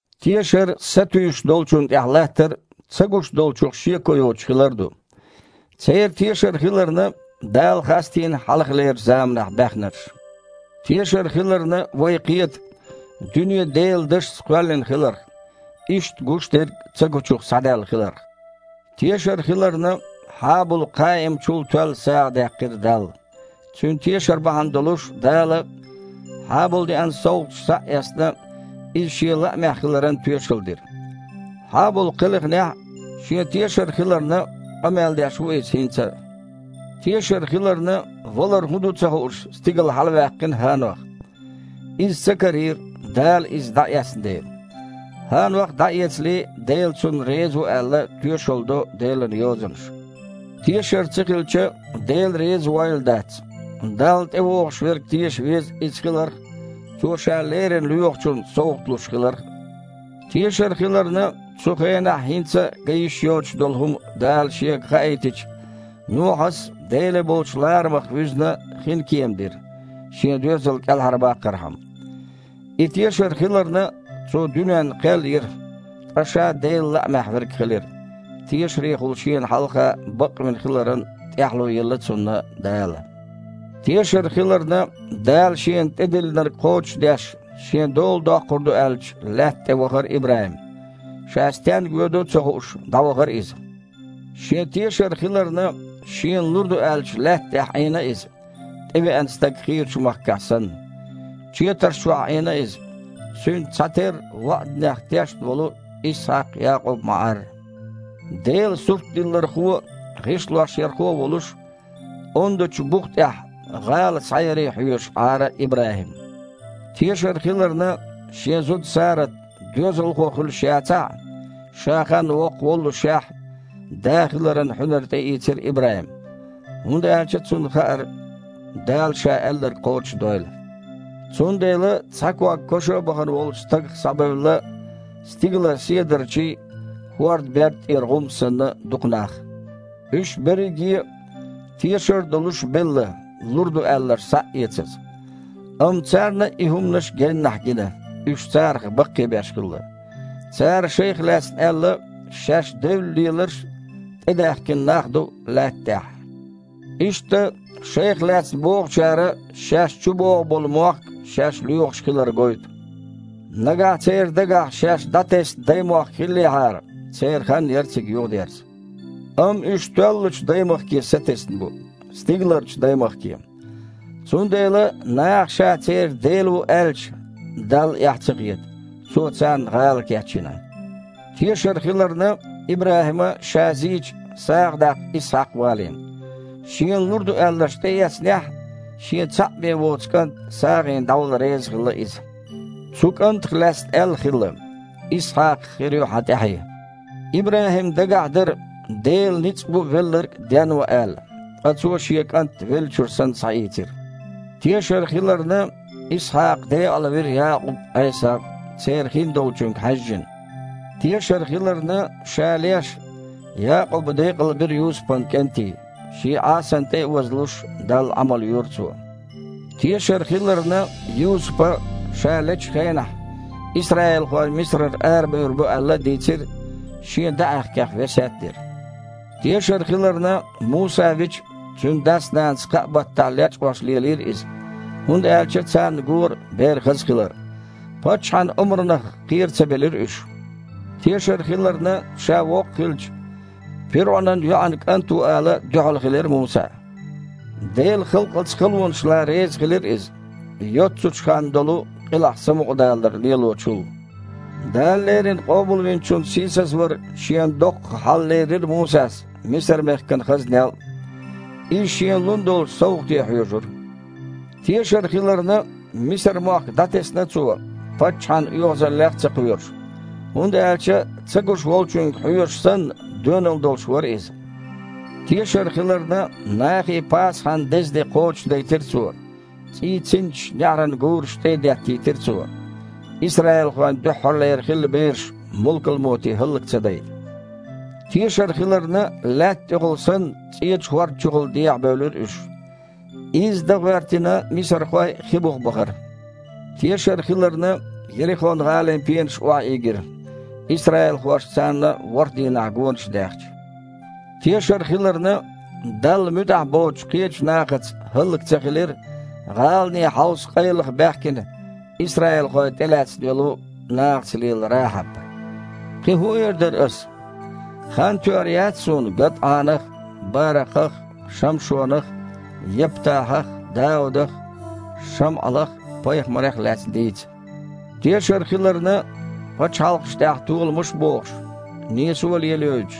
Тешар сатуьйсуш долчунна тІехь латтар а, ца гуш долчух шеко йоцуш хилар а ду. Церан тешар хиларна, Дала хастийна хьалхалерчу заманахь баьхнарш. Тешар хиларна, вай кхета дуьне Делан дашца кхоьллина хиларх, иштта гуш дерг цагучух схьадаьлла хиларх. Тешар хиларна, Хьабула Кхаима чул тоьлла сагІа даьккхира Далла. Цуьнан тешар бахьана долуш Дала, Хьабула деана совгІаташ схьа а эцна, иза Шен лаамехь хиларан тоьшалла дира. Хьабул кхелхинехь а, шен тешар хиларна, къамел деш ву иза хІинца а. Тешар хиларна, валар хІун ду ца хууш, стигала хьалаваьккхина ХІанох: «...иза ца карийра, Дала иза дІаэцна дела». ХІанох дІаэцале, Дела цунна реза ву аьлла, тоьшалла до Делан Йозанаша. Тешар ца хилча, Дела реза войла дац. Далла тІевогІуш верг теша веза Иза хиларх а, Цо Ша леррина лоьхучунна совгІат луш хиларх а. Тешар хиларна, цу хенахь хІинца а ган йиш йоцуш долу хІума Дала шега хаийтича, Нохьас, Деле болчу ларамах вуьзна, хинкема дира, шен доьзал кІелхьарбаккхархьама. И тешар хиларна, цо дуьненна кхел йира, ткъа ша Делан лаамехь верг хилира: тешарехула Шена хьалха бакъвина хиларан тІаьхьало елла цунна Дала. Тешар хиларна, Дала шена тІедиллинарг кхочушдеш, шен дола доккхур ду аьллачу лаьтта тІе вахара ИбрахІим. Ша стенга воьду а ца хууш, дІавахара иза. Шен тешар хиларна, шена лур ду аьллачу лаьтта тІехь Іийна иза, тІевеана стаг хийрачу махкахь санна. Четарш чохь Іийна иза, цуьнца цхьатерра ваІданех тешна волу Исхьакх а, Якъуб а ма-Іарра. Дела суртдиллархо а, гІишлоярхо а волуш, ондачу бух тІехь гІала схьаяре хьоьжуш Іара ИбрахІим. Тешар хиларна, шен зуда Сарат доьзалхо хуьлуш яцахь а, ша ханна воккха воллушехь, да хиларан хьуьнар тІеийцира ИбрахІима, хІунда аьлча цунна хаьара, Дала Ша аьлларг кхочушдойла. Цундела цхьа ког коша а бахана волчу стагах схьабевлла, стигалара седарчий а, хІордан берда тІера гІум а санна, дукха нах. Уьш берриге а, тешар а долуш, белла, лур ду аьлларш схьа а эцаза. Амма царна и хІуманаш геннахь гина, уьш царах баккхийбеш хилла. Цара шайх лаьцна аьлла, шаьш девлла леларш а, тІедаьхкина нах а ду лаьтта тІехь. Иштта шайх лаьцна бохучара шаьш чубогІу болу мохк шаьш лоьхуш хилар гойту. Нагахь церан дагахь шаьш дІатесна даймохк хиллехьара, церан хан яра цига юхадерза. Амма уьш тоьллачу даймахке сатесна бу – стигаларчу даймахке. Цундела, наха Ша церан Дела ву аьлча, Далла эхь ца хета: Цо царна гІала кечйина. Тешар хиларна, ИбрахІима, ша зийча, сагІа даккха Исхьакх валийна. Шена лур ду аьлларш тІеэцнехь а, шен цхьаъ бен воцу кІант сагІина дІавала резахилла иза. Цу кІантах лаьцна аьлла хилла: «Исхьакхах хир ю хьан тІаьхье». ИбрахІимна дагахь дара, Делан ницкъ бу велларг а денван аьлла – ткъа цо шен кІант веллачуьра санна схьаийцира. Тешар хиларна, Исхьакха декъалвира Якъуб а, Іесав а, церан хиндолчуьнга хьаьжжина. Тешар хиларна, ша леш, Якъуба декъалбира Юсупан кІентий, шен Іасанна тІе а вазлуш, Далла Іамал йора цо. Тешар хиларна, Юсупа, ша лечу хенахь, исраилхой Мисарара арабевр бу аьлла а дийцира, шен даьІахкех весет а дира. Тешар хиларна, Муса вича, цуьнан дас-нанас кхаа баттахь лечкъош лелийра иза, хІунда аьлча царна гора бер хаза хилар. Паччахьан омранах кхера ца белира уьш. Тешар хиларна, ша воккха хилча, пирІунан йоІан кІант ву ала дуьхьал хилира Муса. Делан халкъаца халонаш лан резахилира иза, йоццачу ханна долу къилахь самукъадалар лелочул. Дала леррина Къобалвинчун сийсазвар шена доккхаха хьал лерира Мусас Мисар-мехкан хазнел а. Иза шена лун долчу совгІате хьоьжура. Тешар хиларна, Мисар-мохк дІатесна цо, паччахьан оьгІазаллех а ца кхоьруш, хІунда аьлча, ца гуш Волчуьнга хьоьжуш санна, доьналла долуш вара иза. Тешар хиларна, нахе Пасахьан деза де кхочушдайтира цо, цІийн цинцаш неІаран гурашна тІе а деттийтира цо, исраилхойн дуьххьара хилла бераш мулкалмоте хІаллак ца дайта. Тешар хиларна, лаьтта тІехула санна, ЦІечу хІорда чухула дехьабевлира уьш. Изза дан гІоьртина мисархой хи буха бахара. Тешар хиларна, Ерихон-гІалин пенаш охьаийгира, исраилхоша царна ворхІ дийнахь гонаш даьхча. Тешар хиларна, Далла муьтІахь боцучу кхечу нахаца хІаллак ца хилира гІалане хьовса къайлаха баьхкина исраилхой тІелаьцна йолу, нахаца лела Рахьаб. Кхин хІун эр дара ас? Хан тоьар яц суна ГадІанах а, Баракхах а, Шамшонах а, Яптахьах а, Даудах а, Шамъалах а, пайхамарех а лаьцна дийца. Тешар хиларна, пачхьалкхашна тІехь толамаш а бохуш, нийсо а лелайойтуш,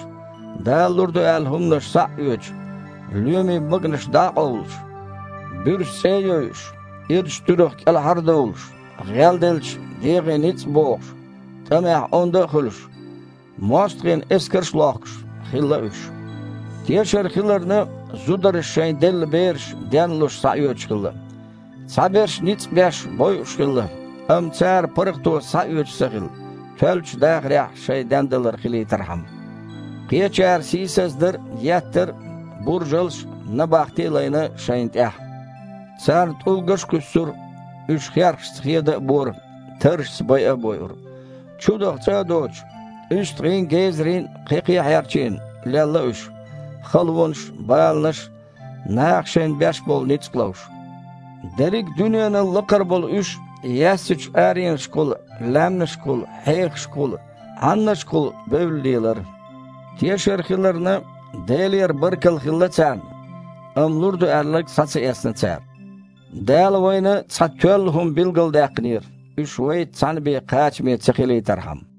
Дала лур ду аьлла хІуманаш схьа а оьцуш, лоьмийн баганаш дІа а къовлуш, буьрса цІе а йойуш, ирачу туьрах кІелхьар а довлуш, гІелделча, дегІе ницкъ а богІуш, тІамехь онда а хуьлуш, мостагІийн эскарш а лохкуш, хилла уьш. Тешар хиларна, зударша шайн делла бераш, ден а луш, схьаоьцуш хилла. Цхьаберш, ницкъ а беш, бойуш хилла, амма цара паргІато схьаоьцуш ца хилла, тоьллачу дахарехь шайн дендалар хилийтархьама. Кхечара сийсаздар а, еттар а, буржалш а, набахти а лайна шайна тІехь. Царна тІулгаш а кхуьссура, уьш херхашца хеда а бора, таррашца байа а бойура. Чудаха цІа а доцуш, уьстагІийн а, гезарийн а кхекхий а хьерчийна, лелла уьш, халонаш а, баланаш а, наха шайна беш болу ницкъ а ловш. Дерриг а дуьненал лакхара болу уьш яьссачу аренашкахула, лаьмнашкахула, хьехашкахула, Іаннашкахула бевлла лелара. Тешар хиларна, Делера баркалла хилла царна, амма лур ду аьлларг схьа ца эцна цара. Дала вайна цхьа тоьлла хІума билгалдаьккхинера, уьш вайца цхьаьна бен кхачаме ца хилийтархьама.